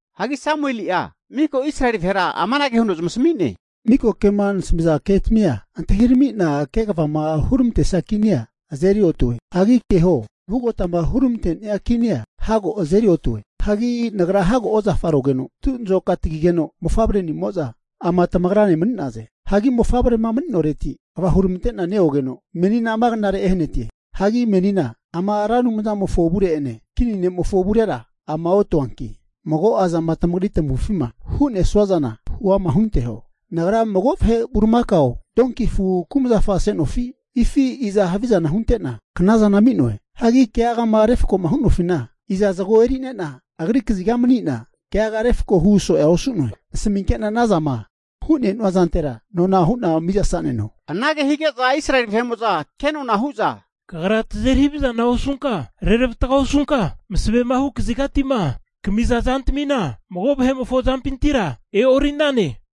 Hagi Samueli'a miko Israeli vahera amanage huno zamasami'ne, Miko kema nasamiza ketami antahirami'na kegavama huramantesia kinia azeri otue. Hagi keho, vugotama huramante'nia kinia hago azeri otue. Hagi nagra hago ozafarogeno, tu'nazoka tagigeno mofavre'nimo'za ama tamagrane mani'naze. Hagi mofavrema mani'noreti kva huramante'na neogeno menina ama knare ehanatie. Hagi menina ama Ra Anumzamofo avure'ene kini ne'mofo avurera ama otuanki, mago'a zama tamagri tamavufima hu'nesua zana huama hunanteho. Nagra mago vahe bulimakao o donki afu kumzafa ase'nofi? Hifi iza havizana hunte'na knazana ami'noe? Hagi keagama refko hu'nofina iza zago eri'nena, agri kaziga mani'na keaga refako hu so'ea osu'noe. Nasaminke'na anazama hu'ne'nua zantera nona hu'na mizasa'neno. Anage hige'za Israeli vahe'mo'za kenona hu'za, Kagra tazeri havizana osunka, reravatga osunka, masavema hu kazigati'ma kamiza zantamina mago vahe'mofo zampintira e'ori'nane.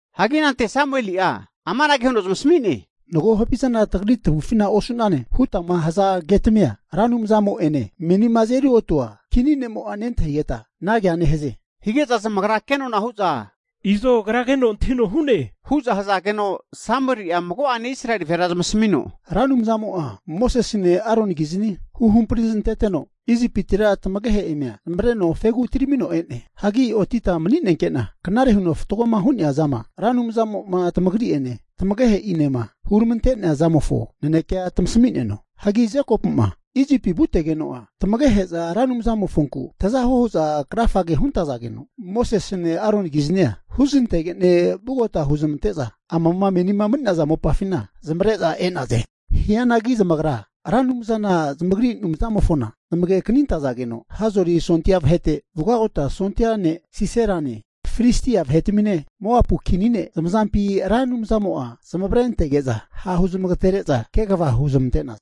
Hagi anante Samueli'a amanage huno zamasami'ne, Mago havizana tagri tavufina osu'nane hutama haza ketamia, Ra Anumzamo'ene menima azeri otua kini ne'mo'a nentahigeta anagea nehaze, hige'za zamagra kenona'a hu'za, Izo agra keno antahino hu'ne hu'za hazageno, Samueli'a mago'ane Israeli vahera zamasamino, Ra Anumzamo'a Mosesene Aronikizni huhampri zananteteno, Isipitira tamagehe'ina zamavareno fegi atiramino e'ne. Hagi otita mani'nenke'na knare huno fatgoma hu'nea zama Ra Anumzamo'ma tamagri'ene tamagehe'inema huramante'nea zamofo nanekea tamasami'neno. Hagi Jekopu'ma Isipi vutegeno'a, tamagehe'za Ra Anumzamofonku tazahuo hu'za krafage huntazageno, Mosesene Aronikiznia huznantege'ne vugota huzamante'za amama menima mani'naza mopafina zamavare'za e'naze. Hianagi zamagra Ra Anumzana zamagri Anumzamofona zamage kanintazageno, Hazori sondia vahete vugagota sondia ne' Siserane, Filistia vahetamine, Moapu kini ne' zamazampi Ra Anumzamo'a zamavarentege'za, ha' huzmagatere'za kegava huzmante'naze.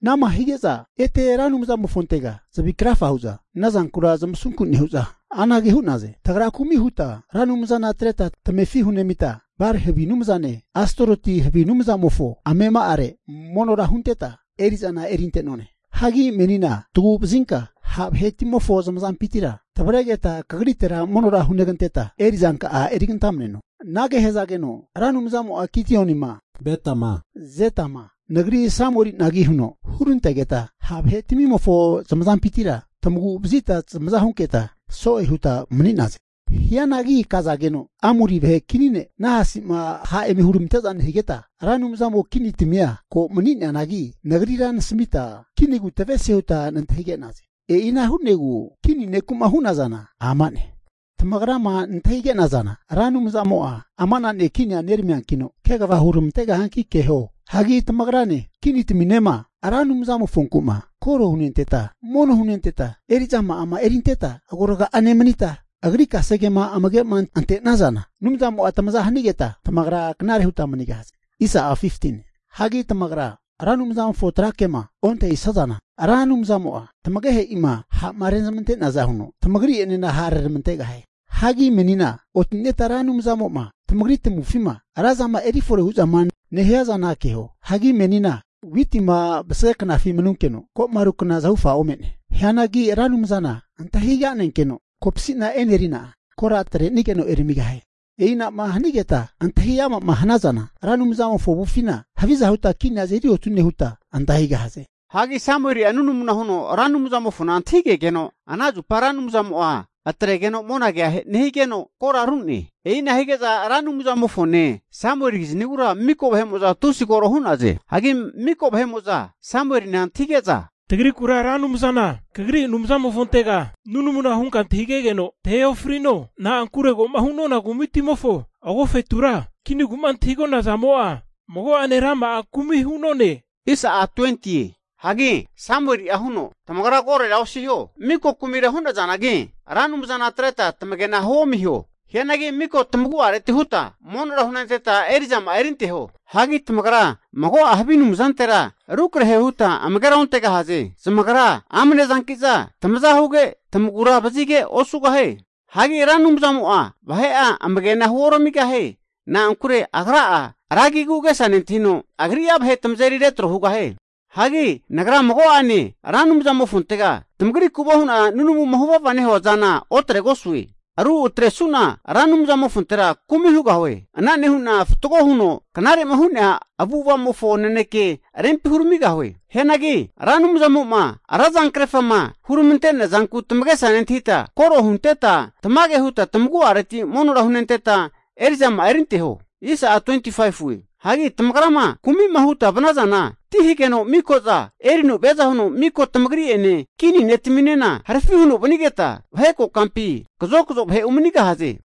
Anama hige'za ete Ra Anumzamofontega zavi krafa hu'za ana zankura zamasunku nehu'za anage hu'naze, tagra kumi huta Ra Anumzana atreta tamefi hunemita, Ba'ali havi anumzane, Astaroti havi anumzamofo amema'are monora hunteta eri'zana erinte'none. Hagi menina tagu'vazinka ha' vahetimofo zamazampintira tavaregeta kagritera monora huneganteta erizanka'a erigantamaneno. Anage hazageno Ra Anumzamo'a Gidionima, Bedama, Jeptama, nagri Samuelinagi huno hurantegeta, ha' vahe tamimofo zamazampintira tamagu'vazita tamaza hunketa, so'e huta mani'naze. Hianagi kazageno Amori vahe kini ne' Nahasi'ma ha' eme huramante'za nehigeta, Ra Anumzamo kinitamia ko mani'neanagi nagrira nasamita, kinigu tavesie huta nantahige'naze. E'ina hu'negu kini neku'ma hu'nazana ama'ne. Tamagrama nantahi ke'nazana, Ra Anumzamo'a ama'na ne' kinia neramiankino kegava huramantegahianki keho. Hagi tamagrane kinitaminema Ra Anumzamofonku'ma koro hunenteta, mono hunenteta eri'zama'a erinteta agoraga'a nemanita, agri kasegema amage'ma ante'nazana Anumzamo'a tamaza hanigeta tamagra knare huta manigahaze. Hagi tamagrama Ra Anumzamofo tra kema ontahisazana, Ra Anumzamo'a tamagehe'ima ha'ma rezmante'neaza huno tamagri'enena hara reramantegahie. Hagi menina oti'neta Ra Anumzamo'ma tamagri tamavufima razama erifore hu'zama nehia zana keho. Hagi menina witima vasage knafi manunkeno, ko'ma ru kna zahufa ome'ne. Hianagi Ra Anumzana antahiga'nenkeno kopasina e'nerina, kora atre'nigeno eramigahie. E'inama hanigeta antahiama'ma hanazana Ra Anumzamofo avufina haviza huta kinia azeri otune huta antahigahaze. Hagi Samueli'a nunamu huno Ra Anumzamofona antahigegeno, ana zupa Ra Anumzamo'a atregeno monagea nehigeno, kora ru'ne. E'ina hige'za Ra Anumzamofone Samuelikiznigura miko vahe'mo'za tusi koro hu'naze. Hagi miko vahe'mo'za Samuelina antahige'za, tagrikura Ra Anumzana kagri Anumzamofontega nunamu hunka antahigegeno tahe ofrino. Na'ankure ko'ma hu'nona kumitimofo agofetura kinigu'ma antahigona zamo'a, mago'ane rama'a kumi hu'none. Hagi Samueli'a huno, Tamagra korora osiho, miko kumira hunazanagi, Ra Anumzana atreta tamagena huomiho. Hianagi maka tamagu'areti huta monora hunenteta eri'zama'a erinteho. Hagi tamagra mago'a havi anumzantera rukrahera huta amagera ontegahaze. Zamagra amnezanki'za tamaza huge tamagura vazige osugahie. Hagi Ra Anumzamo'a vahe'a amagena huoramigahie. Na'ankure Agra'a ra agigu agesa nentahino, Agri'a vahe tamazeri retro hugahie. Hagi nagra mago'ane Ra Anumzamofontega tamagriku hu'na nunamuma huvava nehua zana otregosue. Ru atresu'na Ra Anumzamofontera kumi hugahue. Ana nehu'na fatgo huno knare'ma hu'nea avu'ava'mofo nanekea rempi huramigahie Hianagi Ra Anumzamo'ma ra zankrefama huramante'nea zanku tamagesa nentahita, koro hunteta tamage huta tamagu'areti monora hunenteta eri'zama'a erinteho. Hagi tamagrama kumi'ma huta vanazana, ti hageno miko'za erino viaza huno miko tamagri'ene kini ne' taminena harafi huno vanigeta, vahe kokampi kazokazo vahe umanigahaze.